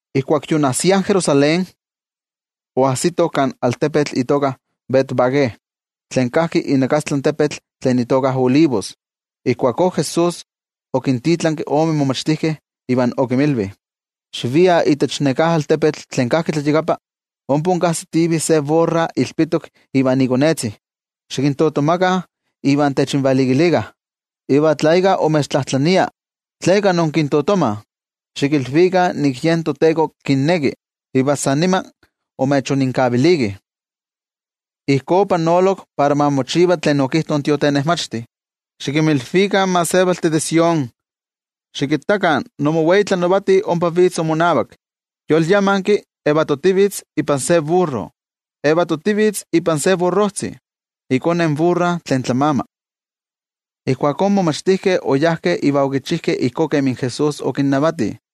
Ijkuak yoonajsiah Jerusalén, oajsitoh kan altepetl itoka Betfagé, tlen kajki inakastlan tepetl tlen itoka Olivos, iva ijkuakó Jesús okintitlanki ome momachtijkeh, iva okinmilvi: —Xiviah itech neká altepetl tlen kajki tlayakapa. Ompa inkajsitivih se burra ilpitok ivan ikonezti. Xikintotomakah iva techinvalikilikah. Iva tla íkka imechtlajtlania tleka inkintotomah, xikilvikah nik yen toTeko kinneki, iva san nima imechoninkavilikih. Ijkó opanolok para ma mochiva tlen okijto in tiotenejmachti: Xikinmilvikah in gentejtih de Sión: “Xikittakah, nimowei tlanavati ompa vitz imonavak, yolyamanki, yetivitz ipan se burro, ipan se burrojtzi, ikone in burra tlen tlamama.” Ijkuakó in momachtijkeh oyajkeh iva okichijkeh ijkó kemi Jesús okinnavati.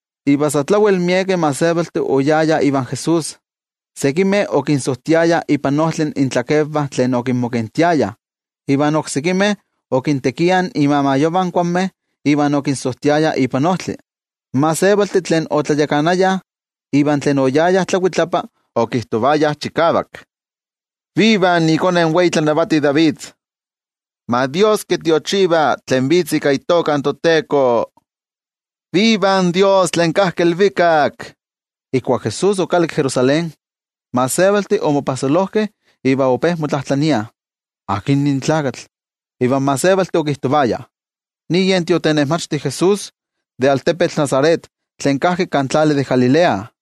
Iva sa tlawel miekeh gentejtih oyayah ivan Jesús, sekimeh okinsojtiayah ipan ojtli intlakenvah tlen okinmokentiayah iva oksekimeh okintekiah imamayovah in kuanmeh iva okinsojtiayah ipan ojtli. In gentejtih tlen otlayakanayah, iva tlen oyayah tlakuitlapa, okijtojtiayah chikavak: —¡Viva ikone in wei tlanavati David! ¡Ma Dios kitiochiva tlen vitz ika itoka in toTeko! ¡Viva in Dios tlen kajki ilvikak! Ijkuak Jesús okalakki Jerusalén, in gentejtih omopajsolojkeh iva ope motlajtlaniah: —¿Akin nin tlakatl? Iva in gentejtih okijtovayah: —Nin yen tiotenejmachti Jesús de altepetl Nazaret tlen kajki kan tlali de Galilea.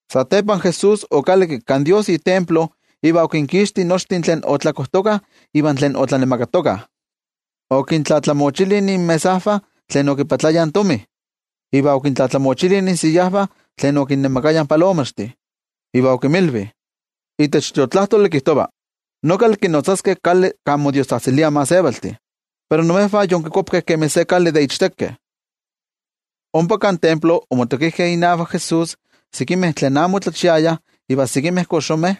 Satepa Jesús okalakki kan toYejwatzi itemplo ik kiavak, iva okinkixti nochtin tlen otlakojtokah iva tlen otlanemakatokah. Okintlatlamochili inmesajvah tlen okipatlayah tomi, iva okintlatlamochili insiyajvah tlen okinnemakayah palomaxtih. Iva okinmilvi: —Itech Tiotlajkuiloli kijtova: “Nokal kinotzaskeh kali kan modiostzajtziliah in gentejtih.” Pero imejvah yonkikuapkeh kemi se kali de ichtekeh. Ompa kan templo omotokijkeh inavak Jesús sekimeh tlen amo otlachiayah iva sekimeh koxomeh,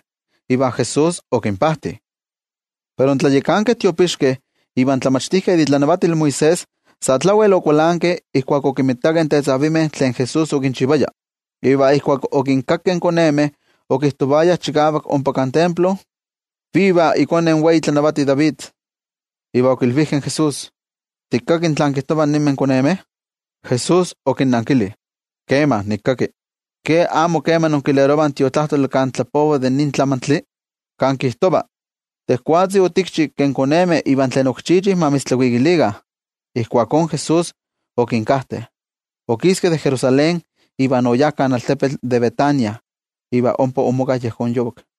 iva Jesús okinpajti. Pero in tlayakankeh tiopixkeh iva in tlamachtijkeh de itlanavatil Moisés, sa tlawel okualankeh ijkuak okinmitakeh in tetzavimeh tlen Jesús okinchivaya, iva ijkuak okinkakkeh in konemeh okijtovayah chikavak ompa kan templo: “¡Viva ikone in wei tlanavati David!” Iva okilvijkeh in Jesús: —¿Tikaki tlán kijtovah ninmeh konemeh? Jesús okinnankili: —Kema, nikinkaki. ¿Ke amo kema inkilerovah in Tiotlajkuiloli kan tlapova de nin tlamantli? Kan kijtova: Tejwatzi otikchi ke in konemeh iva tlen ok chichih, ma mitztlakuikilikah. Ijkuakó Jesús okinkajte, okiski de Jerusalén iva oyá kan altepetl de Betania iva ompa omoka yejón yovak.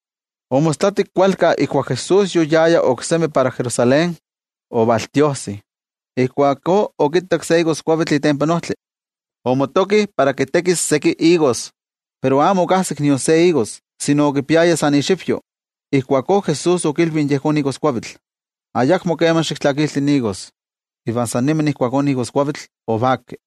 Omostlatik kualkanpa ijkuak Jesús yoyaya oksemi para Jerusalén, otiojsi. Ijkuakó okittak se igoskuavitl itempan ojtli, omotoki para kitekis seki igos, pero amo okajsik nion se igos, sino okipiaya san puro ixivyo. Ijkuakó Jesús okilvi yejón igoskuavitl: —¡Ayakmo kema xiktlakilti igos! Iva san nima ijkuakó in igoskuavitl ovaki.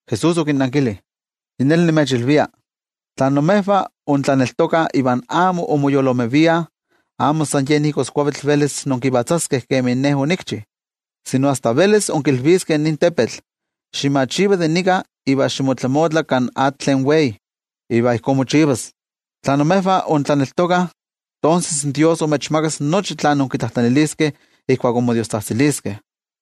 Jesús okinnankili: —Yi neli nimechilvia, tla imejvah intlaneltokah iva amo inmoyoloomeviah, amo san yen igoskuavitl velis inkivatzaskeh kemin Ne onikchi, sino asta velis inkilviskeh nin tepetl: “Ximachiva de nika iva ximotlamotla kan atl tlen wei”, iva ijkó mochivas. Tla imejvah intlaneltokah, tonses Dios imechmakas nochi tlen inkitlajtlaniliskeh ijkuak inmodiostzajtziliskeh.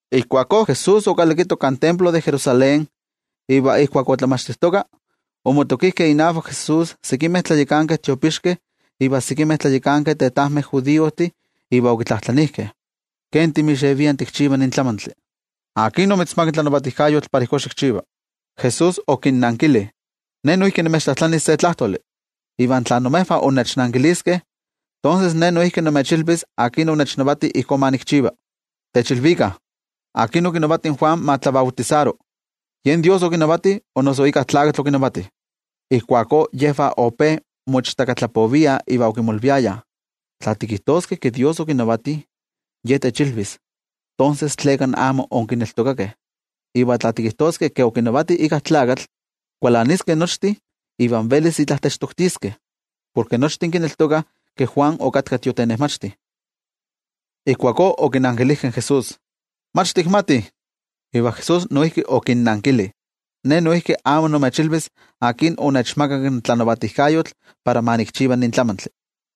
Ijkuakó Jesús okalakito kan templo de Jerusalén iva ijkuak otlamachtijtoka, ovalmotokijkeh inavak sekimeh tlayakankeh tiopixkeh iva sekimeh tlayakankeh tetajmeh judiojtih iva okitlajtlanijkeh: —¿Ken timixevia tikchiva nin tlamantli? ¿Akin omitzmakak tlanavatijkayotl para ijkó xikchiva? Jesús okinnankili: —Ne noijki nimechtlajtlanis se tlajtoli, iva tla imejvah innechnankiliskeh, tonses Ne noijki nimechilvis akin onechnavati ijkó ma nikchiva. Techilvikah, ¿akin okinavati in Juan ma tlabautisaro? ¿Yen Dios okinavati o noso íkka tlakatl okinavati? Ijkuakó yejvah ope moichtakatlapoviah iva okimolviayah: —Tla tikijtoskeh ke Dios okinavati, Ye techilvis: “¿Tonses tleka amo inkineltokakeh?” Iva tla tikijtoskeh ke okinavati íkka tlakatl, kualaniskeh nochtin iva velis itla techtoktiskeh, porke nochtin kineltokah ke Juan okatka tiotenejmachti. Ijkuakó okinankilijkeh in Jesús: —Mach tikmatih. Iva Jesús noijki okinnankili: —Ne noijki amo nimechilvis akin onechmakak tlanavatijkayotl para ma nikchiva nin tlamantli.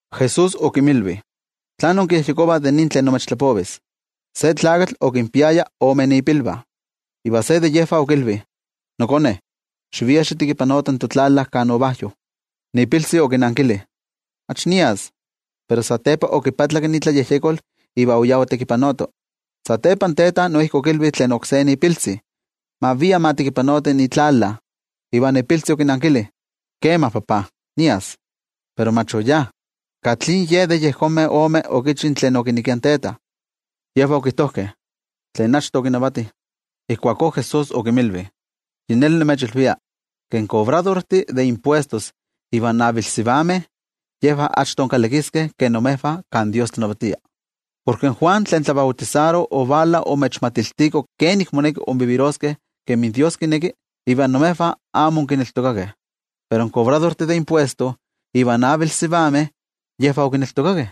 Jesús okinmilvi: —¿Tlán inkiyejyekovah de nin tlen nimechtlapovis? Se tlakatl okinpiaya ome ipilvah, iva se de yejvah okilvi: “Nokone, xivia xitekipanoti totlala kan uvajyo.” Ipiltzi okinankili: “¡Mach nias!” Pero satepa okipatlak itlayejyekol iva oyá otekipanoto. Satepa in teta noijki okilvi tlen oksé ipiltzi ma via ma tekipanoti itlala, iva ipiltzi okinankili: “Kema, papa, nias.” Pero mach oyá. ¿Katli ye de yejonmeh omeh okichi tlen okinekia in teta? Yejvah okijtojkeh: —Tlen achto okinavati. Ijkuakó Jesús okinmilvi: —Yi neli nimechilvia, ke in kobradortih de impuestos iva in avilsivameh, yejvah achto kalakiskeh ke imejvah kan Dios tlanavatia. Porke in Juan tlen tlabautisaro ovala omechmachtiko kenik moneki inviviroskeh kemi Dios kineki, iva imejvah amo onkineltokakeh. Pero in kobradortih de impuestos iva in avilsivameh yejvah okineltokakeh.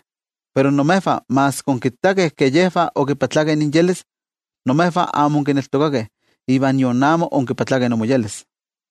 Pero imejvah maski onkittakeh ke yejvah omoyolkuapkeh, imejvah amo onkineltokakeh iva nion amo onmoyolkuapkeh.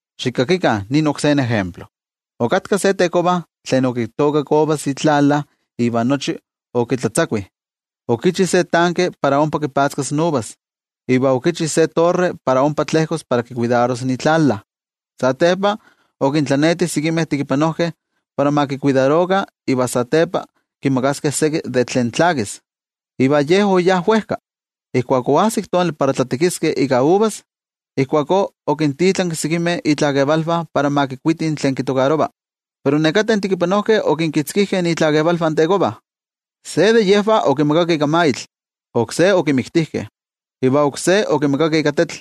’Xikakikah nin oksé ejemplo: Okatka se tekova tlen okitookak uvas itlala iva nochi okitlatzakui. Okichi se tanke para ompa kipatzkas uvas, iva okichi se torre para ompa tlejkos para kikuidaros itlala. ’Satepa okintlaneti sekimeh tekipanojkeh para ma kikuidarokah iva satepa kimakaskeh seki de tlen tlakis, iva ye oyá wejka. Ijkuak oajsik tonali para tlatekiskeh ika uvas, ijkuakó okintitlanki sekimeh itlakevalvah para ma kikuitih tlen kitokarova. Pero nekateh tekipanojkeh okinkitzkijkeh itlakevalvah in tekova. Se de yejvah okimagakeh ika maitl, oksé okimiktijkeh, iva oksé okimagakeh ika tetl.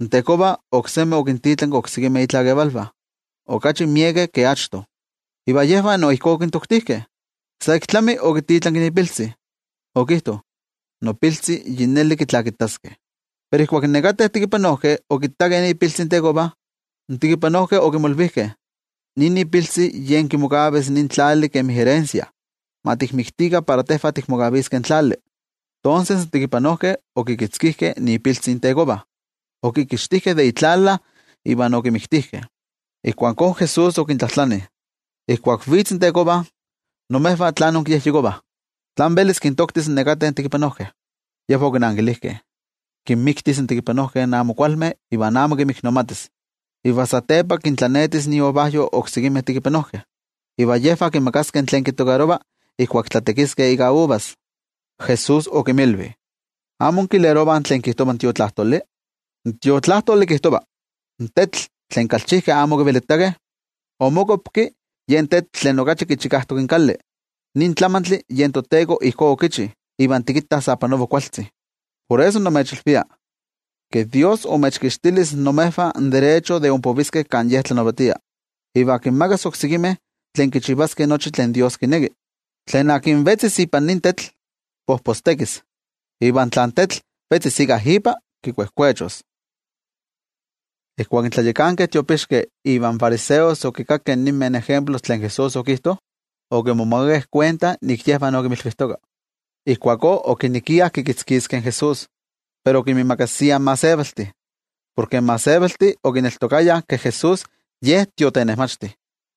In tekova oksemi okintitlanki oksekimeh itlakevalvah, okachi miekeh ke achto. Iva yejvah no ijkó okintoktijkeh. ’Sa ik tlami, okititlanki ipiltzi, okijto: “Nopiltzi yi neli kitlakitaskeh.” Pero ijkuak nekateh tekipanojkeh okittakeh ipiltzi in tekova, in tekipanojkeh okimolvijkeh: “Nin ipiltzi yen kimokavis nin tlali kemi erensia. Ma tikmiktikah para tejvah tikmokaviskeh in tlali.” Tonses in tekipanojkeh okikitzkijkeh ipiltzi in tekova, okikixtijkeh de itlala iva okimiktijkeh. Ijkuakó Jesús okintlajtlani: —Ijkuak vitz in tekova, ¿imejvah tlán inkiyejyekovah? ¿Tlán velis kintoktis nekateh tekipanojkeh? Yejvah okinankilijkeh: —Kinmiktis in tekipanojkeh amo kualmeh iva amo kinmiknomatis. Iva satepa kintlanetis iuvajyo oksekimeh tekipanojkeh, iva yejvah kimakaskeh tlen kitokarova ijkuak tlatekiskeh ika uvas. Jesús okinmilvi: —¿Amo inkilerovah tlen kijtova in Tiotlajkuiloli? In Tiotlajkuiloli kijtova: In tetl tlen kalchijkeh amo okivelitakeh, omokuapki yen tetl tlen okachi kichikajtok in kali. Nin tlamantli yen toTeko ijkó okichi, iva tikittah sa panova kualtzi. Por eso nimechilvia, ke Dios imechkixtilis imejvah in derecho de inpoviskeh kan Ye tlanavatia, iva kinmakas oksekimeh tlen kichivaskeh nochi tlen Dios kineki. Tlen akin vetzis ipan nin tetl, pojpostekis. Iva tla in tetl vetzis íkka ipa, kikuejkuechos. Ijkuak in tlayakankeh tiopixkeh ivan fariseos okinkakkeh ninmeh ejemplos tlen Jesús okijto, okimomakakeh kuenta nik yejvah okinmilvijtoka. Ijkuakó okinekiah kikitzkiskeh in Jesús, pero okinmiimakasiah in gentejtih, porke in gentejtih okineltokayah ke Jesús Ye tiotenejmachti.